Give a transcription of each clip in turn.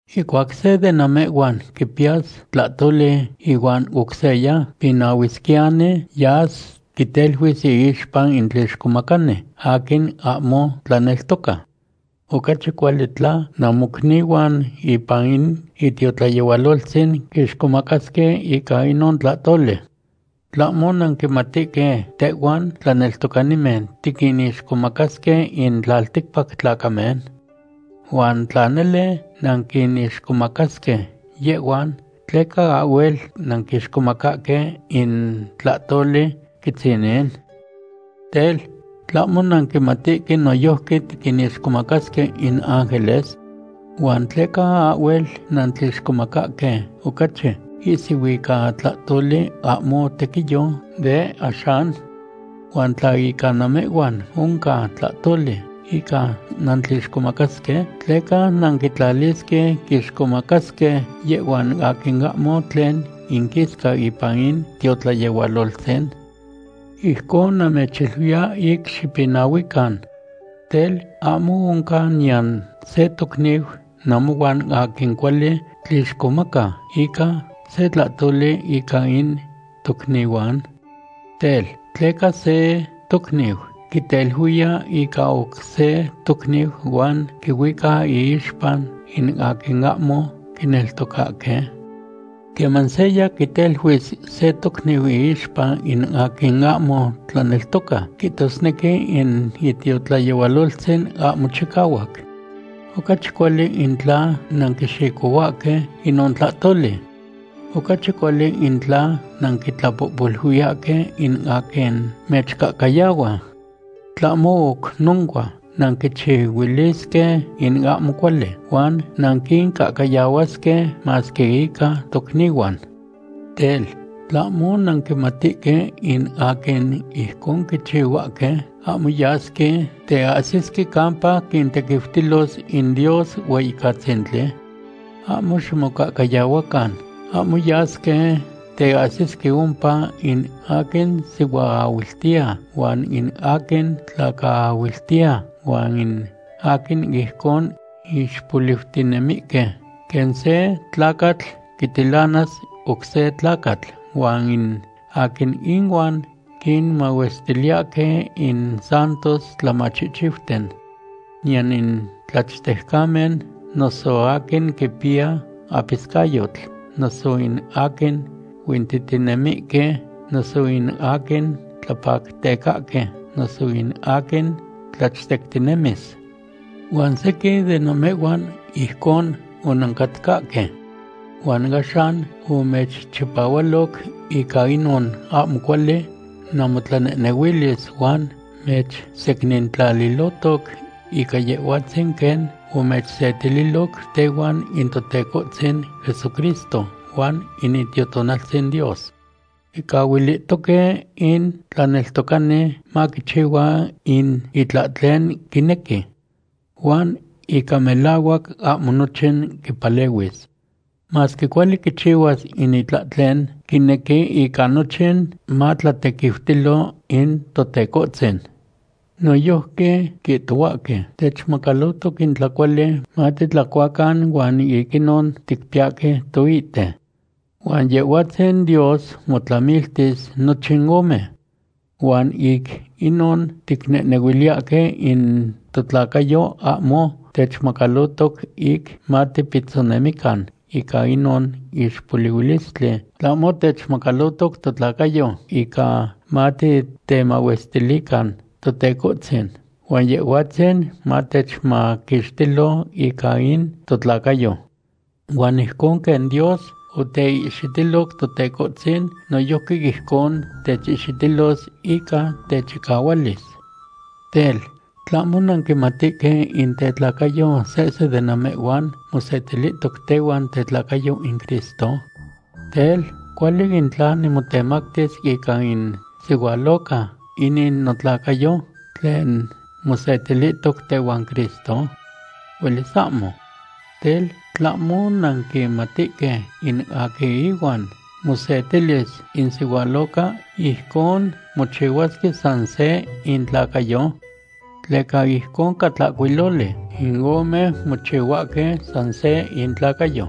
Ihcuac se de namehhuan quipiyas tlahtoli ihuan oc seya, pinahuisquiyani yas quiteluis iixpa in tlixcomacani aquin ahmo tlaneltoca. Ocachi cuali tla namocnihuan ipan in itiotlayehualoltzin quixcomacasque ica inon tlahtoli. ¿Tlahmo nanquimatihque tehhuan tlaneltocanimen tiquinixcomacasque in tlalticpac tlacamen? Huan tla nele nanquinixcomacasque yehhuan, ¿tleca ahhuel nanquixcomacahque in tlahtoli quitzinin? Tel, ¿tlahmo nanquimatihque noyojqui tiquinixcomacasque in ángeles? ¿Huan tleca ahhuel nantlixcomacahque ocachi ihsiu ica tlahtoli ahmo tequiyo de axan? Huan tla ica namehhuan oncan tlahtoli ica nantlixcomacasque, ¿tleca nanquitlalisque quixcomacasque yehhuan aquin ahmo tlen inquisca ipan in tiotlayehualoltzin? Ijcon namechiluiya ic xipinahuican. Tel, ¿ahmo oncan niyan se tocniu namohuan aquin cuali tlixcomaca ica se tlahtoli ica in tocnihuan? Tel, ¿tleca se tocniu quiteluiya ica oc se tocniu huan quihuica iixpa in aquin ahmo quineltocahque? Queman seya quiteluis se tocniu iixpa in aquin ahmo tlaneltoca, quihtosnequi in itiotlayehualoltzin ahmo chicahuac. Ocachi cuali in tla nanquixicohuahque inon tlahtoli. Ocachi cuali in tla nanquitlapohpoluiyahque in aquin mechcahcayahua. Tlahmo oc noncua, nanquichihuilisque in ahmo cuali, huan nanquincahcayahuasque, masque ica tocnihuan. Tel, ¿tlahmo nanquimatihque in aquin ijcon quichihuahque, ahmo yasque teahsisque campa quintequiutilos in Dios Hueyicatzintli? Ahmo ximocahcayahuacan, ahmo yasque teahsisque ompa in aquin sihuaahuiltiya huan in aquin tlacaahuiltiya huan in aquin ijcon ixpoliutinemihque, quen se tlacatl quitilanas oc se tlacatl huan in aquin inuan quinmahuestiliyahque in santos tlamachihchiuten. Niyan in tlachtejcamen, noso aquin quipiya apiscayotl, noso in aquin huintihtinemihque, noso in aquin tlapactecahque, noso in aquin tlachtectinemis. Huan sequin de namehhuan ijcon onancatcahque. Huan axan omechchipahualoc ica inon ahmo cuali namotlanehnehuilis huan mechsecnintlalilotoc ica Yehhuatzin quen omechsetililoc tehuan in Totecohtzin Jesucristo huan in Itiotonaltzin Dios. Quicahuilihtoque in tlaneltocani maquichihua in itlahtlen quinequi. Huan ica melahuac ahmo nochin quipalehuis. Masque cuali quichihuas in itlahtlen quinequi, ica nochin matlatequiutilo in Totecohtzin. Noyojqui quihtohuahque: “Techmacalotoc in tlacuali matitlacuacan huan ic inon ticpiyahque toite.” Huan Yehhuatzin Dios motlamiltis nochin ome. Huan ic inon ticnehnehuiliyahque in totlacayo ahmo techmacalotoc ic matipitzonemican ica inon ixpolihuilistli, tlahmo techmacalotoc totlacayo ica matitemahuestilican Totecohtzin, huan Yehhuatzin matechmaquixtilo ica in totlacayo. Huan ijcon quen Dios oteihxitiloc Totecohtzin, noyojqui ijcon techihxitilos ica techicahualis. Tel, ¿tlahmo nanquimatihque in itlacayo sehse de namehhuan mosetilihtoc tehuan tetlacayo in Cristo? Tel, ¿cuali in tla nimotemactis ica in sihualoca inin notlacayo tlen mosetilihtoc tehuan Cristo? ¡Huelis ahmo! Tel, ¿tlahmo nanquimatihque in aquin ihuan mosetilis in sihualoca, ijcon mochihuahque san se intlacayo? Tleca ijcon ca tlacuiloli: “In ome mochihuahque san se intlacayo.”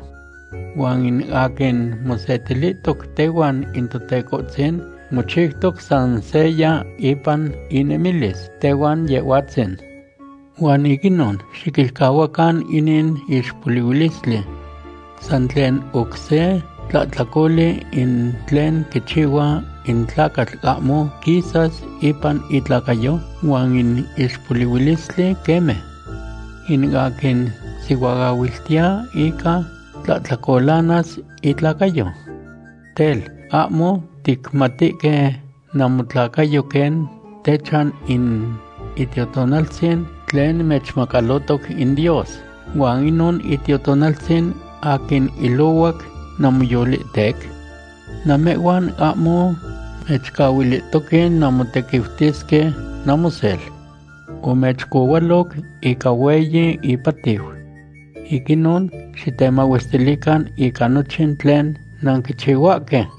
Huan in aquin mosetilihtoc tehuan in Totecohtzin mochiutoc san seya ipan inemilis tehuan Yehhuatzin. Huan ic inon, xiquilcahuacan inin ixpolihuilistli. San tlen oc se tlahtlacoli in tlen quichihua in tlacatl ahmo quisas ipan itlacayo, huan in ixpolihuilistli queme. In aquin sihuaahuiltiya ica tlahtlacolanas itlacayo. Tel, ¿ahmo ticmatihque namotlacayo quen techan in Itiotonaltzin tlen mechmacalotoc in Dios huan inon Itiotonaltzin aquin ilohuac namoyolihtec? Namehhuan ahmo mechcahuilihtoque nanmotequiutisque namosel. Omechcohualoc ica hueyi ipatiu. Ic inon xitemahuestilican ica nochin tlen nanquichihuahque.